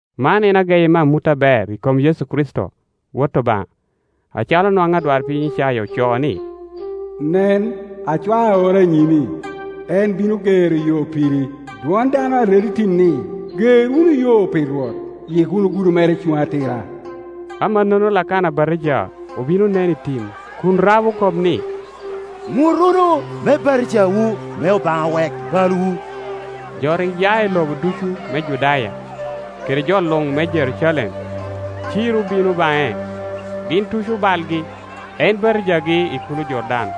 Man en ageyi me amut aber i kom Yecu Kricito, Wot Obaŋa, acalo nwaŋ adwarpiny Icaya ocoo, ni, “Nen, acwao aorra i nyimi; en bino gero yo piri. Dwon dano a redo i tim ni, ‘Ger wunu yo pi Rwot, yik wunu gudo mere cuŋ atira.’” Amannono Lakana Abatija obin onen i tim kun rabo kop ni, “Ŋut wunu, me batijawu, me Obaŋa wek balwu.” Jo rik ya i lobo ducu me Judaya, kede jo luŋ me Jerucalem, ciro bino baŋe. Gin tuco balgi, en batijagi i kulo Jordan.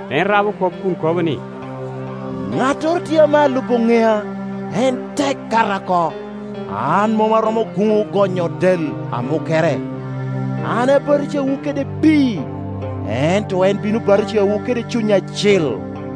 En rabo kop kun kobo ni, “Ŋattoro tye ame alubo ŋea, en tek, kata oko; an mom aromo guŋo gonyo del amukkere. An abatijawu kede pii, ento en bino batijawu kede Cuny Acil.”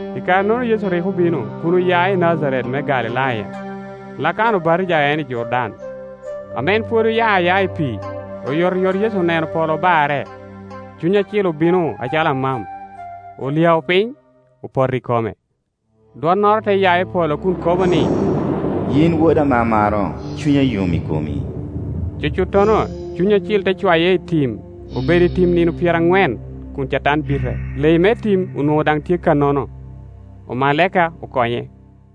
I kare-nono Yecu rik obino kun oya i Najaret me Galilaya, Lakana obatija en i Jordan. Ame en pwod oya ayaa i pii, oyotoyot Yecu oneno polo obarre, Cuny Acil obino acalo amam, olyao piny, opoto i kome. Dwonnoro te ya i polo kun kobo ni, “Yin Woda ame amaro, cunya yom i komi.” Cucuttono Cuny Acil te cwaye itim. Obedo i tim nino pyeraŋwen kun Catan bite. Leyi me tim onwoŋo daŋ tye kannono, omalaika okonye.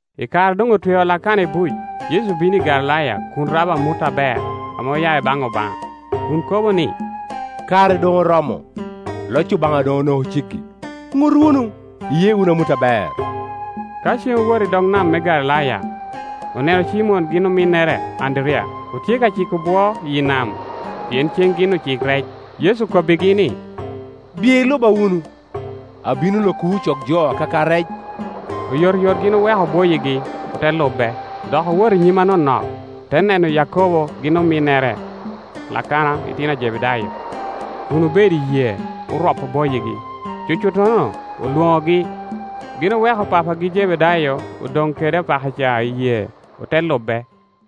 I kare a doŋ otweo Lakana i buc, Yecu obino i Galilaya kun rabo amut aber ame oya i baŋ Obaŋa, kun kobo ni, “Kare doŋ oromo, loc Obaŋa doŋ onoko ceggi; ŋut wunu, iye wunu amut aber.” Ka cen owoto i dog nam me Galilaya, oneno Cimon gin ominnere Anderiya; otye ka ciko bwo iyi nam, pien ceŋ gin ocik rec. Yecu okobbigi ni, “Biye iluba wunu, abino lokowu ocok jo akaka rec.” Oyotoyot gin oweko bwoyigi, ote Lube. Dok owoto i nyim anonok, te neno Yakobo gin ominnere Lakana itino a Jebedayo, kun obedo i yee, oropo bwoyigi. Cucuttono olwonogi, gin oweko papagi Jebedayo odoŋ kede opakaca i yee, ote lube.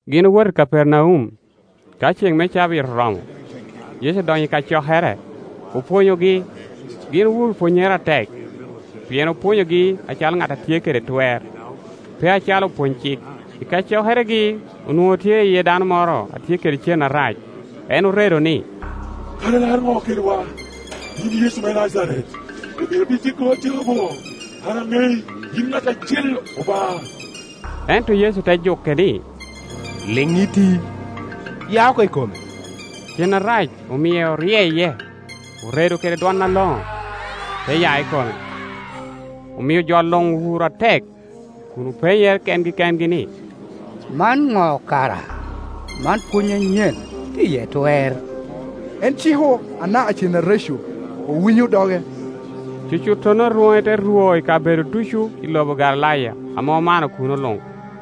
Gin owoto i Kapernaum. Ka ceŋ me cabit oromo, Yecu odonyo i kacokere, opwonyogi. Gin owuro pwonnyere atek, pien opwonyogi acalo ŋat a tye kede twer, pe acalo opwony-cik. I kacokeregi onwoŋo tye iye dano moro a tye kede cen arac. En oredo ni, “Kara ilaro ŋo kedwa, yin Yecu me Najaret? Ibino pi tyekowa atyeka bo? An aŋei, yin Ŋat Acil Obaŋa.” Ento Yecu tejuke ni, “Liŋiti, ya oko i kome.” Cen arac omie oryeye, oredo kede dwon aloŋo, te ya i kome. Omio jo luŋ owuro atek, kun openyere kengi kengi ni, “Man ŋo kara? Man pwony anyen, tye iye twer! En ciko anaka cen areco, owinyo doge.” Cucuttono rwoŋe te rwo i kabedo ducu i lobo Galilaya ame omano kuno luŋ.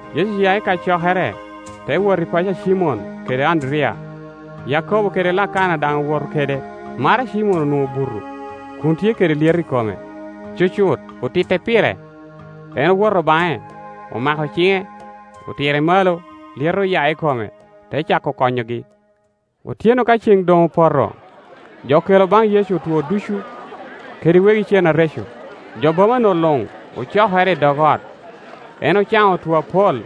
Yecu oya i kacokere, te wot i paco a Cimon kede Anderiya; Yakobo kede Lakana daŋ owoto kede. Maro a Cimon onwoŋo obuto, kun tye kede lyeto i kome; cucut otitte pire. En owoto baŋe, omako ciŋe, otire malo, lyeto oya i kome, te cako konyogi. Otyeno ka ceŋ doŋ opoto, jo okelo baŋ Yecu otwo ducu, kede wegi cen areco; jo boma-nu luŋ ocokere i dog ot! En ocaŋo otwo apol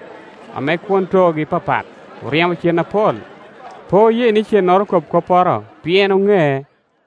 ame kwon toogi papat, oryemo cen apol. Pe oye ni cennoro kob kopporo, pien oŋee.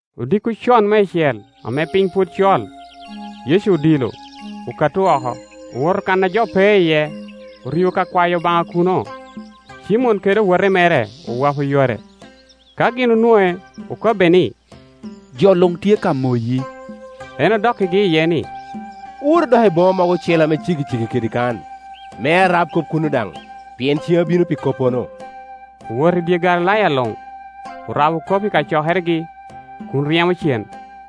Odiko con meicel ame piny pwod col, Yecu odilo, okato oko. Owoto kan a jo pe iye, orio ka kwayo Obaŋa kuno. Cimon kede owote mere owopo yore. Ka gin onwoŋe, okobbe ni, “Jo luŋ tye ka moyi.” En odokkigi iye ni, “Owotu dok i boma mogo ocele ame ceggiceggi kede kan, me arab kop kuno daŋ, pien cen abino pi koppono.” Owoto i dye Galilaya luŋ, orabo kop i kacokeregi, kun ryemo cen.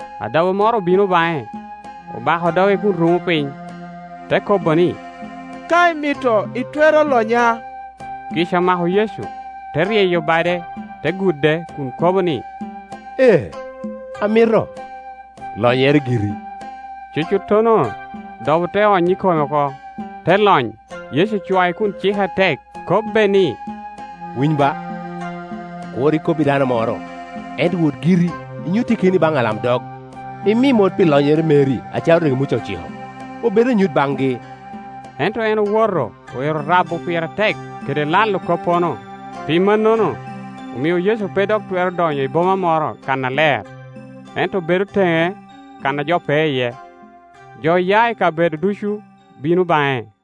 Adobo moro obino baŋe, obako doge kun rumo piny, te kobo ni, “Ka imito, itwero lonya.” Kica omako Yecu, te ryeyo bade, te gude kun kobo ni, “Ee, amito; lonyere giri.” Cucuttono dobo te ony i kome oko, te lony. Yecu ocwae kun cike atek, kobbe ni, “Winy ba, kur ikob i dano moro, ento wot giri, inyutte keni baŋ alamdog, imi mot pi lonyere meri acalo rik Muca ociko, obed anyut baŋgi.” Ento en owoto, oero rabo pire atek, kede lalo koppono. Pi mannono omio Yecu pe dok twero donyo i boma moro kannaler, ento bedo teŋe kan a jo pe iye; jo ya i kabedo ducu bino baŋe.